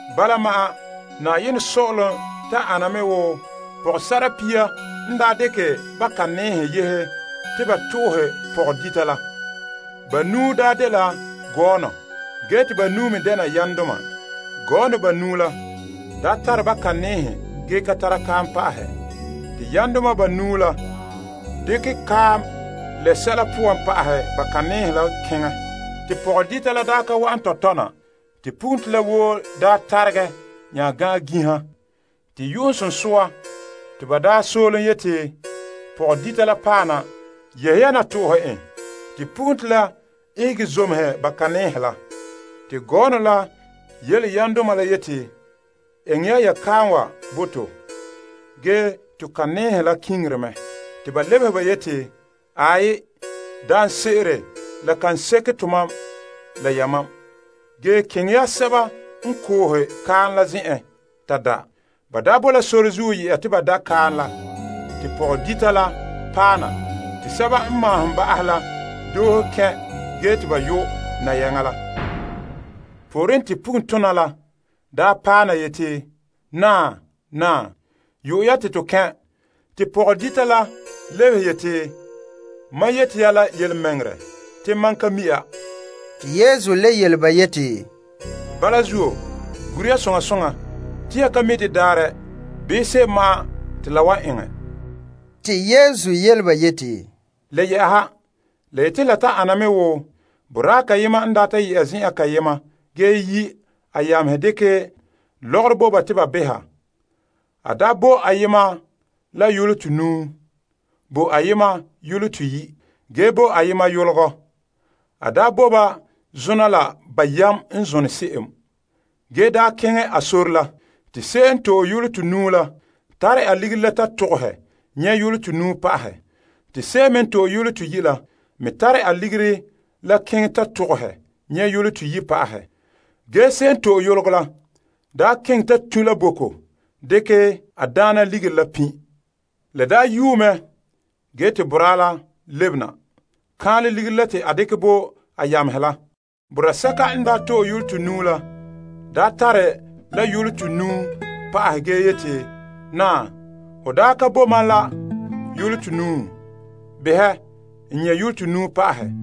Bala ma'an, saazuo sɔ'ɔlom ta ana mɛ wo pɔgɔsa'ara pia n daa dekɛ ba butoleladoma yehe te ba to'ohe pɔgɔdita la. Banuu dela gɔɔnɔ, ge te banuu me dɛna yamdoma. Gɔɔnɔ banuu la tare ba butoleladoma ge ka tara kaam pa'ahɛ. Te yamdoma banuu la dekɛ kaam lee sɛla poan pa'ahɛ ba butoleladoma la keŋɛ. Pɔgɔdita la ka wa'an tɔtɔ na te pugunto la woo daa taregɛ nya gan' ginha. Te yu'uŋsunsua, te ba daa soolom yeti, Pɔgɔdita la paɛ na! Yehe ya na to'ohe en! Te pugunto la ihege zomehe ba butoleladoma la. Te gɔɔnɔ la yele yamdoma la yeti, Eŋɛ ya ya kaam wa bo to, ge to butoleladoma la kiŋire mɛ. Ba lebehe yeti, Aai, daanse'ere la kan seke tomam la yamam, ge keŋɛ ya sɛba n koohe kaam la zen'en ta da. Ban daa bo la sore yɛ'a te ba da' kaam la, te pɔgɔdita la paɛ na te sɛba n maahom ba'ahɛ la doohe kɛn' ge te ba yo' nayaŋa la. Pooren te pugun tona la paɛ na yeti, Naa! Naa! Yo'ɛ ya te to kɛn'! Ge pɔgɔdita la lebehe yeti, Mam yeti ya la yelemɛŋɛrɛ te mam ka mi' ya. Yesu le yele ba yeti, Gure ya soŋa soŋa, yan ka mi' de daarɛ bii se'em ma'an te la wan eŋɛ la zuo. Le yɛ'ɛha, la wan ana me wo boraa kayema n daa ta yɛ'a zen'an kayema ge yi' a yamehe dekɛ lɔgɔrɔ bo ba te ba beha. A daa bo ayema la yolɔ tonuu, bo ayema yolɔ toyi', ge bo ayema yologɔ. A bo ba zona la ba yam n zone se'em. Te a nya keŋɛ a sore la. Se'em n to'e yolɔ tonuu la tare a ligiri la ta togohɛ nyɛ' yolɔ tonuu pa'ahɛ. Se'em me n to'e yolɔ toyi' la tare a ligiri la ta togohɛ nyɛ' yolɔ toyi' pa'ahɛ. Ge se'em n to'e yologɔ la daa keŋɛ ta tun' la boko dekɛ a daana ligiri la pin'. La daa yuu mɛ ge te boraa la lebena kaanlɛ ligiri la te a dekɛ bo a yamehe la. Boraa sɛka n to'e yolɔ tonuu la tare la yolɔ tonuu pa'ahɛ ge yeti, Naa, ho daa ka bo ma la yolɔ tonuu. Behɛ n nyɛ' yolɔ tonuu pa'ahɛ.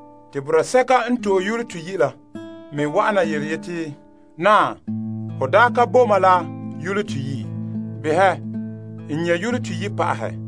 Te boraa sɛka n to'e yolɔ toyi' la me wa'ana yeti, Naa, ho daa ka bo ma la yolɔ toyi'. Behɛ n nyɛ' yolɔ toyi' pa'ahɛ.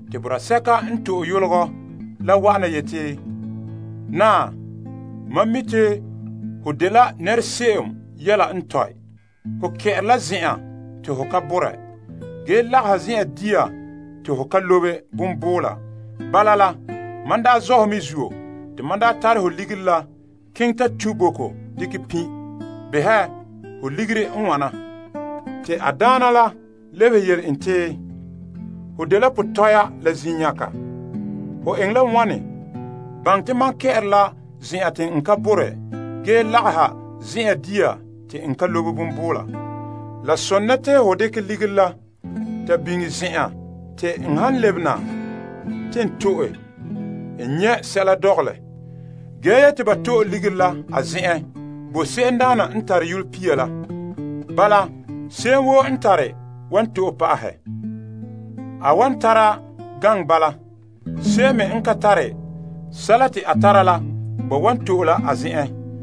Te boraa sɛka n to'e yologɔ la wa'ana yeti, Naa, mam mi' te ho dela nɛra se'em yɛla n tɔe. Ho kɛ'ɛre la zen'an te ho ka borɛ, ge lagaha zen'an dia te ho ka lobe bonbuula. Man zɔ' la dabeem hɔ zuo, te n tare ho ligiri yehe ta tu' boko dekɛ pin'. Behɛ, ho ligiri n wana. A daana la lebehe yeti, Ho dela potɔpa la zenyaga! Hon seren baŋɛ te mam kɛ'ɛre la zen'an te n ka borɛ ge lagaha zen'an dia te n ka lobe bonbuula? La sone te ho dekɛ ligiri la ta biŋe zen'an te n han lebena te n to'e, n nyɛ' sɛla dɔgɔlɛ. Ge daana la yeti ba to'e ligiri la a zen'en bo se'emdaana n tare yolɔ pia la. Bala se'em woo n tare wan to'e pa'ahɛ a wan tara gaŋɛ bala. Se'em me n ka tare, sɛla fiin te a tara la, ba wan to'e la a zen'en.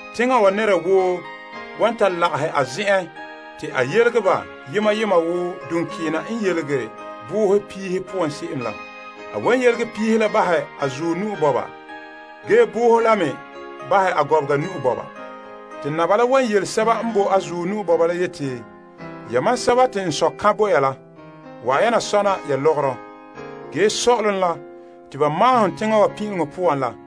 Teŋhe woo nɛra wan ta lagahɛ a nɛŋan te a yelege ba yema yema wo duŋkeena n ne yelege boohe piihe poan se'em la. A wan yelege piihe la bahɛ a zuɔ ge boohe la me bahɛ a gɔbega. Te Naba la wan yele sɛba n boe a zuɔ la yeti, Wa'ana, yamam sɛba te n Sɔ' eŋɛ som bo ya, sɔna ya sɔ'ɔlom la te ba maahom teŋa wa pin'ileŋɔ poan la.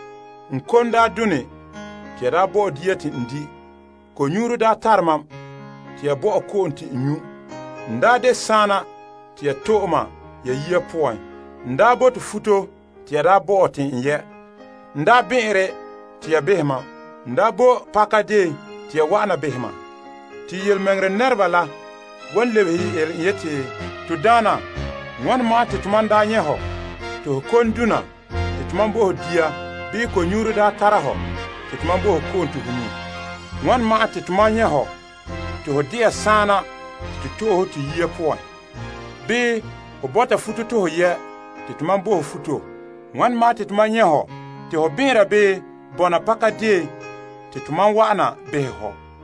N kom daa done te ya bo mam dia te n di'. Ko'nyuuro daa tare mam te ya bo mam ko'om te n nyu'. N daa de saana te ya to'e mam ya yiya poan. N daa eere la bele te ya yɛlɛ mam futo. N daa bɛn'ɛnre te ya behɛ mam. N daa boe pakadeen te ya wa'ana behɛ mam. Yelemɛŋɛrɛ nɛreba la wan nya lebehe yeti, To Daana, wane ma'an te to daa nyɛ' hɔ te ho kon daa dona te tomam bo ho dia bii ko'nyuuro daa tara hɔ te bo ko'om te ho nyu'? Wane ma'an te tomam nyɛ' hɔ te ho de'a saana te to to'e ho to yiya poan bii ho ɛɛra bele te tomam bo ho futo te ho yɛ'? Wane ma'an te tomam nyɛ' hɔ te ho bɛn'ɛnra bii bɔna pakadeen te tomam wa'ana behɛ hɔ?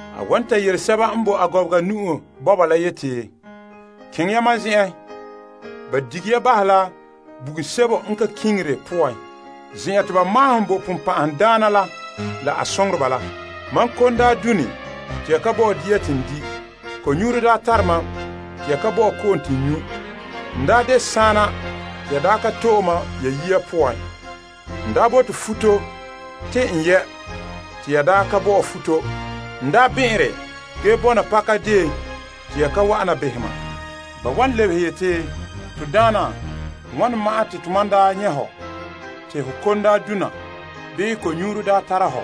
A wan nya ta yele sɛba n boe a gɔbega la yeti, Keŋɛ ya mam zen'en, ya se'em te ba wan dige bahɛ la bugum sebo n ka kiŋire poan, zen'an te ba maahom bo sagona la la a soŋoreba la. Se'ere n sɔe, mam kon daa done te ya ka bo mam dia te n di'. Ko'nyuuro daa tare mam te ya ka bo mam ko'om te n nyu'. N daa de saana te ya daa ka to'e mam ya yiya poan. N daa eere la bele te ya ka bo mam futo. N daa bɛn'ɛnre ge bɔna pakadeen te ya ka wa'ana behɛ mam. Ba wan lebehe yeti, To Daana, wane ma'an te tomam daa nyɛ' hɔ te ho kon daa dona bii ko'nyuuro daa tara hɔ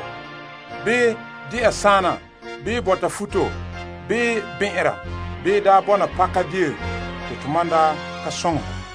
bii de'a saana bii bɔta futo bii bɛn'ɛnra bii daa bɔna pakadeen te tomam daa ka soŋɛ hɔ?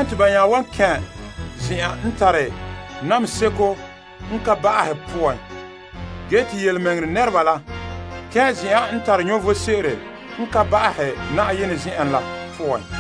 Ba nya wan kɛn' zen'an n tare namehe seko n ka ba'ahe poan. Ge te tontɔɔdoma la kɛn' zen'an n tare vom sebo n ka ba'ahɛ Na'ayenɛ zen'en.